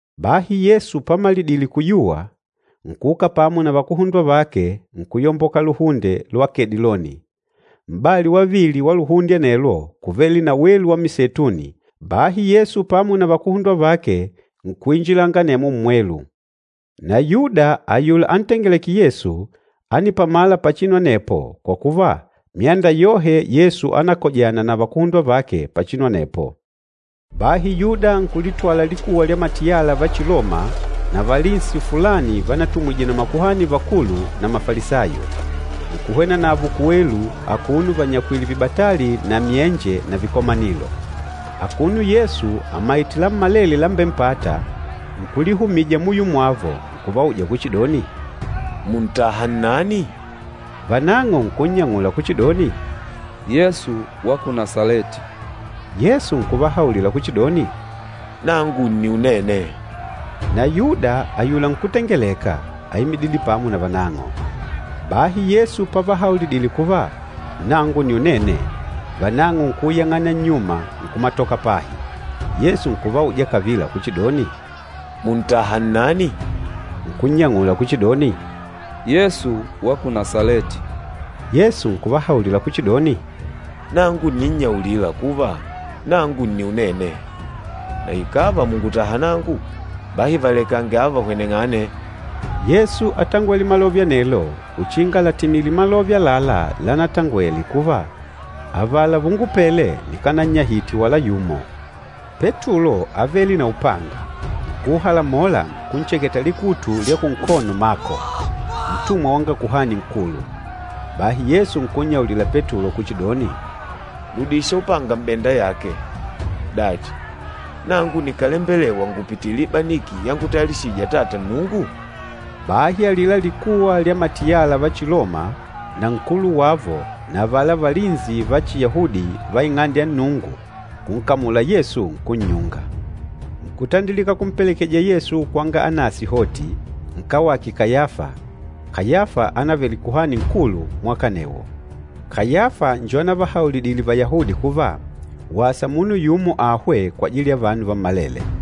Bahi Yesu pamalidile kuyuwa, nkuuka pamo na vakuhundwa vake nkuyomboka Lubobolo lwa Kediloni. Mpata wavili wa lubobolo anelwo, kúvele na welu wa miseituni, bahi Yesu pamo na vakuhundwa vake nkuinjilanga anemwo mmwelu. Na Yuda ayula antengelêke Yesu, ánipamala pachinu anepo kwa kuva myanda yohe Yesu ánakojana na vakuhundwa vake pachinu anepo. Bahi Yuda nkulitwala likuwa lya matiyala va Chiloma na valinsi fulani vanatumwije na makuhani vakulu na Mafalisayo. Nkuhwena navo kuwelu akuno vanyakwìlè vibatali na myenje na vikomanilo. Akuno Yesu amaìtè lammalele lambempâta, nkulihumija muyo mwavo, nkuvauja kuchidoni, “Mùntaha nnani?” Vanang'o nkunnyang'ula kuchidoni, “Yesu wa ku Nasaleti!” Yesu nkuvahaulila kuchidoni, “Nangu nni Unene.” Na Yuda ayula nkútengeleka, áimidile pamo na vanang'o. Bahi Yesu pavahaulidile kuva, “Nangu nni Unene,” vanang'o nkuuyang'ana nnyuma nkumatoka pahi. Yesu nkuvauja kavila kuchidoni, “Mùntaha nnani?” Nkunnyang'ula kuchidoni, “Yesu wa ku Nasaleti!” Yesu nkuvahaulila kuchidoni, “Nangu ǹninnyaulila kuva, ‘Nangu nni Unene.’ Na ikàva mùngutaha nangu, bahi valekange ava vahweneng'ane.” Yesu átangwele malove anelo uchinga làtimile malove àlalá lanatangwele kuva, “Avala vungupele nikanannyahite wala yumo.” Petulo ávele na upanga, nkuuhalamola, nkuncheketa likutu lya kunkono Mako, ntumwa wanga Kuhani Nkulu. Bahi Yesu nkunnyaulila Petulo kuchidoni, “Ludisha upanga m'benda yake. Dachi, nangu nikálembelewa ngupitile ibaniki yangutayalishijije Atata Nnungu?” Bahi alila likuwa lya matiyala va Chiloma na nkulu wavo na avala valinsi va Chiyahudi va Ing'ande ya Nnungu nkunkamula Yesu, nkunnyunga. Nkutandilika kumpelekeja Yesu kwanga Anasi hoti, nkawake Kayafa, Kayafa ánavele Kuhani Nkulu mwaka anewo. Kayafa njo anavahaulidile Vayahudi kuva, wasa munu yumo ahwe kwajili ya vanu vammalele.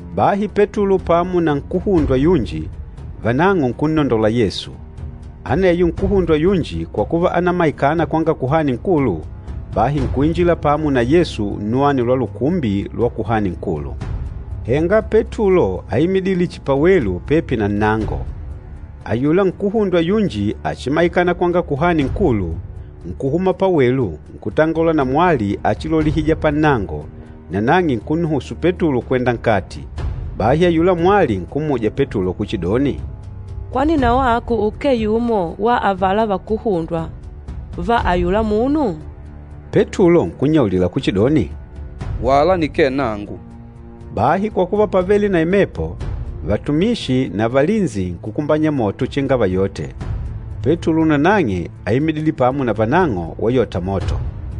Bahi Petulo pamo na nkuhundwa yunji, vanang'o nkunnondola Yesu. Aneyo nkuhundwa yunji kwa kuva ánamaikana kwanga Kuhani Nkulu, bahi nkuinjila pamo na Yesu nnuwani lwa lukumbi lwa Kuhani Nkulu. Henga Petulo áimidile chihi pawelu pepi na nnango. Ayula nkuhundwa yunji achimaikana kwanga Kuhani Nkulu, nkuhuma pawelu, nkutangola na mwali achilolihija pannango, nanang'e nkunnuhusu Petulo kwenda nkati. Bahi ayula mwali nkummuja Petulo kuchidoni, “Kwani na wako ukee yumo wa avala vakuhundwa va ayula munu?” Petulo nkunnyaulila kuchidoni, “Wala nikee nangu!” Bahi kwa kuva pávele na imepo, vatumishi na valinsi nkukumbanya moto uchinga vayote. Petulo nanang'e áimidile pamo na vanang'o wayota moto.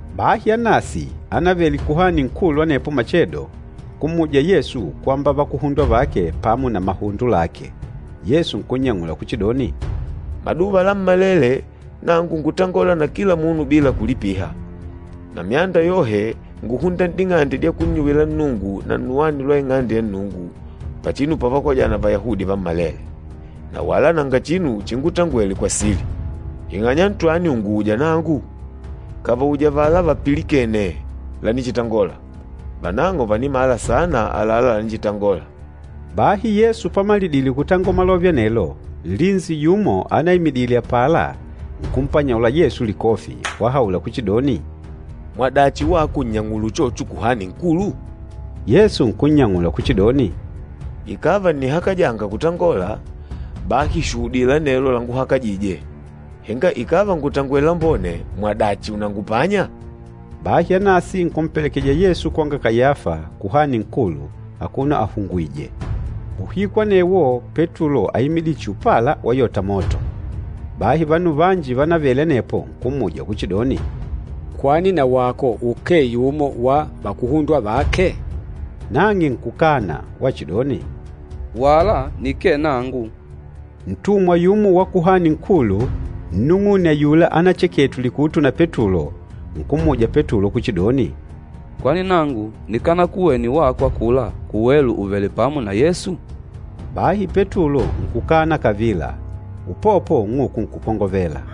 Bahi Anasi, ánavele Kuhani Nkulu anepo machedo, nkummuja Yesu kwamba vakuhundwa vake pamo na mahundo lake. Yesu nkunnyang'ula kuchidoni, “Maduva lammalele, nangu ngútangola na kila munu bila kulipiha, na myanda yohe ngúhunda n'ding'ande dya kunnyuwila Nnungu na nnuwani lwa Ing'ande ya Nnungu, pachinu pavakojana Vayahudi vammalele. Na wala nanga chinu chingutangwele kwa sili. Ing'anya ntwani ùnguuja nangu? Kavauje avala vapilikene lanichitangola, vanang'o vànimala sana àlalá lanichitangola.” Bahi Yesu pamalidile kutangola malove anelo, nlinsi yumo anaimidile apala nkumpanyaula Yesu likofi, wahaula kuchidoni, “Mwadachi wako ùnnyang'ula uchocho Kuhani Nkulu?” Yesu nkunnyang'ula kuchidoni, “Ikàva ǹnihakajanga kutangola, bahi shuhudila anelo laǹguhakajîje. Henga ikàva ngùtangwele lambone, mwadachi unangupanya?” Bahi Anasi nkumpelekeja Yesu kwanga Kayafa, Kuhani Nkulu, akuno ahungwìjè. Uhiku anewo Petulo áimidile chihi upala wayota moto. Bahi vanu vanji vánavele anepo nkummuja kuchidoni, “Kwani na wako ukee yumo wa vakuhundwa vake?” Nang'e nkukana wachidoni, “Wala nikee nangu!” Ntumwa yumo wa Kuhani Nkulu, nnung'une ayula ánacheketwe likutu na Petulo, nkummuja Petulo kuchidoni, “Kwani nangu nikanakuwene wako akula kuwelu ùvele pamo na Yesu?” Bahi Petulo nkukana kavila, upopo ung'uku nkukongovela.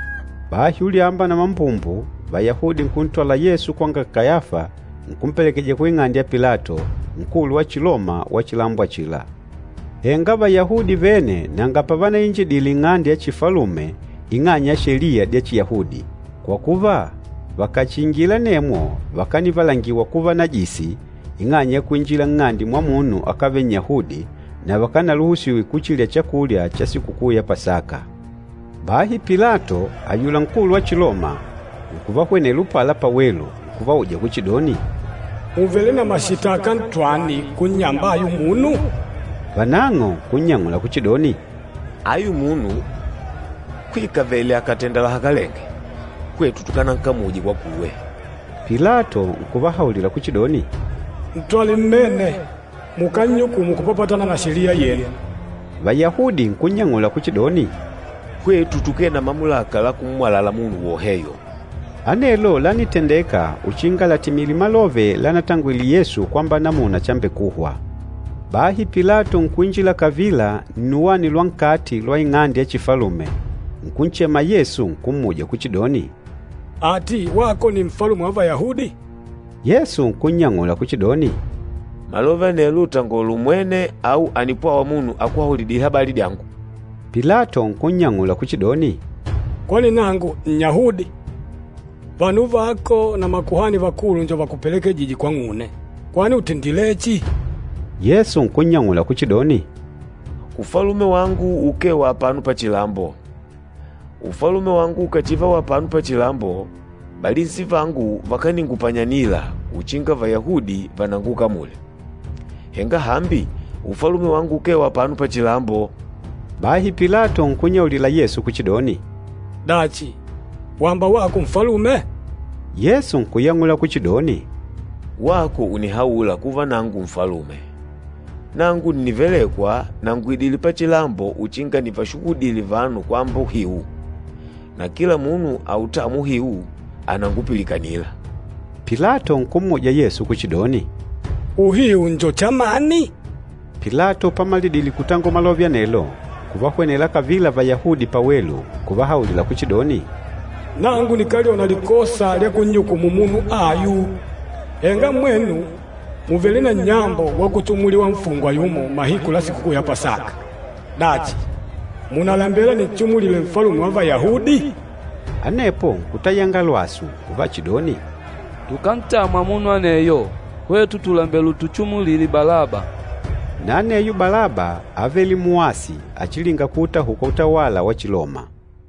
Bahi ulyamba na mambumbu Vayahudi nkuntwala Yesu kwanga Kayafa nkumpelekeja kuing'ande ya Pilato, nkulu wa Chiloma wa chilambo achila. Henga Vayahudi vene nanga pavanainjidile nng'ande ya chifalume ing'anya ya sheliya dya Chiyahudi, kwa kuva vakàchiingila anemwo vakanivalangiwa kuva najisi ing'anya ya kuinjila nng'ande mwa munu akávele Nnyahudi na vakanaluhusiwe kuchilya chakulya cha Sikukuu ya Pasaka. Bahi Pilato ayula nkulu wa Chiloma, nkuvahwenela upala pawelu nkuvauja kuchidoni, “Mùvele na mashitaka ntwani kunnyamba ayu munu?” Vanang'o nkunnyang'ula kuchidoni, “Ayu munu kwikavele akàtenda lahakalenge, hwetu tukanankamuje kwakuwe.” Pilato nkuvahaulila kuchidoni, “Ntwale mmene mukánnyukumu kupapatana na sheliya yenu.” Vayahudi nkunnyang'ula kuchidoni, “Hwetu tukee na mamulaka la kummwalala munu woheyo.” Anelo lánitendeka uchinga latimile malove lánatangwele Yesu kwamba namuna chambekuhwa. Bahi Pilato nkuinjila kavila nnuwani lwa nkati lwa ing'ande ya chifalume, nkunchema Yesu nkummuja kuchidoni, “Ati wako nni Nfalume wa Vayahudi?” Yesu nkunnyang'ula kuchidoni, “Malove anelo ùtangola umwene au ànipwawa munu akuhaulidile habali dyangu?” Pilato nkunnyang'ula kuchidoni, “Kwani nangu Nnyahudi? Vanu vako na makuhani vakulu njo vakupelekejîje kwang'une. Kwani ùtendilechi?” Yesu nkunnyang'ula kuchidoni, “Ufalume wangu ukee wa apano pachilambo. Ufalume wangu ukàchiva wa apano pachilambo, valinsi vangu vakaningupanyanila uchinga Vayahudi vanangukamule. Henga hambi, Ufalume wangu ukee wa apano pachilambo.” Bahi Pilato nkunnyaulila Yesu kuchidoni, “Dachi, wamba wako nfalume?” Yesu nkuyang'ula kuchidoni, “Wako ùnihaula kuva nangu nfalume. Nangu ǹnivelekwa na ngùidile pachilambo uchinga nivashuhudile vanu kwamba uhiu. Na kila munu autâmwa uhiu ànangupilikanila.” Pilato nkummuja Yesu kuchidoni, “Uhiu njo chamani?” Pilato pamalidile kutangola malove anelo, nkuvahwenela kavila Vayahudi pawelu, nkuvahaulila kuchidoni, “Nangu nikályona likosa lya kunnyukumu munu ayu. Henga mwenu mùvele na nnyambo wakuchimuliwa nfungwa yumo mahiku la Sikukuu ya Pasaka. Dachi, mùnalembela ninchimulile Nfalume wa Vayahudi?” Anepo nkutayanga lwasu uvachidoni, “Tukántamwa munu aneyo! Hwetu tùlembela utuchimulile Balaba!” Na aneyo Balaba ávele muasi achilinga kuutahuka utawala wa Chiloma.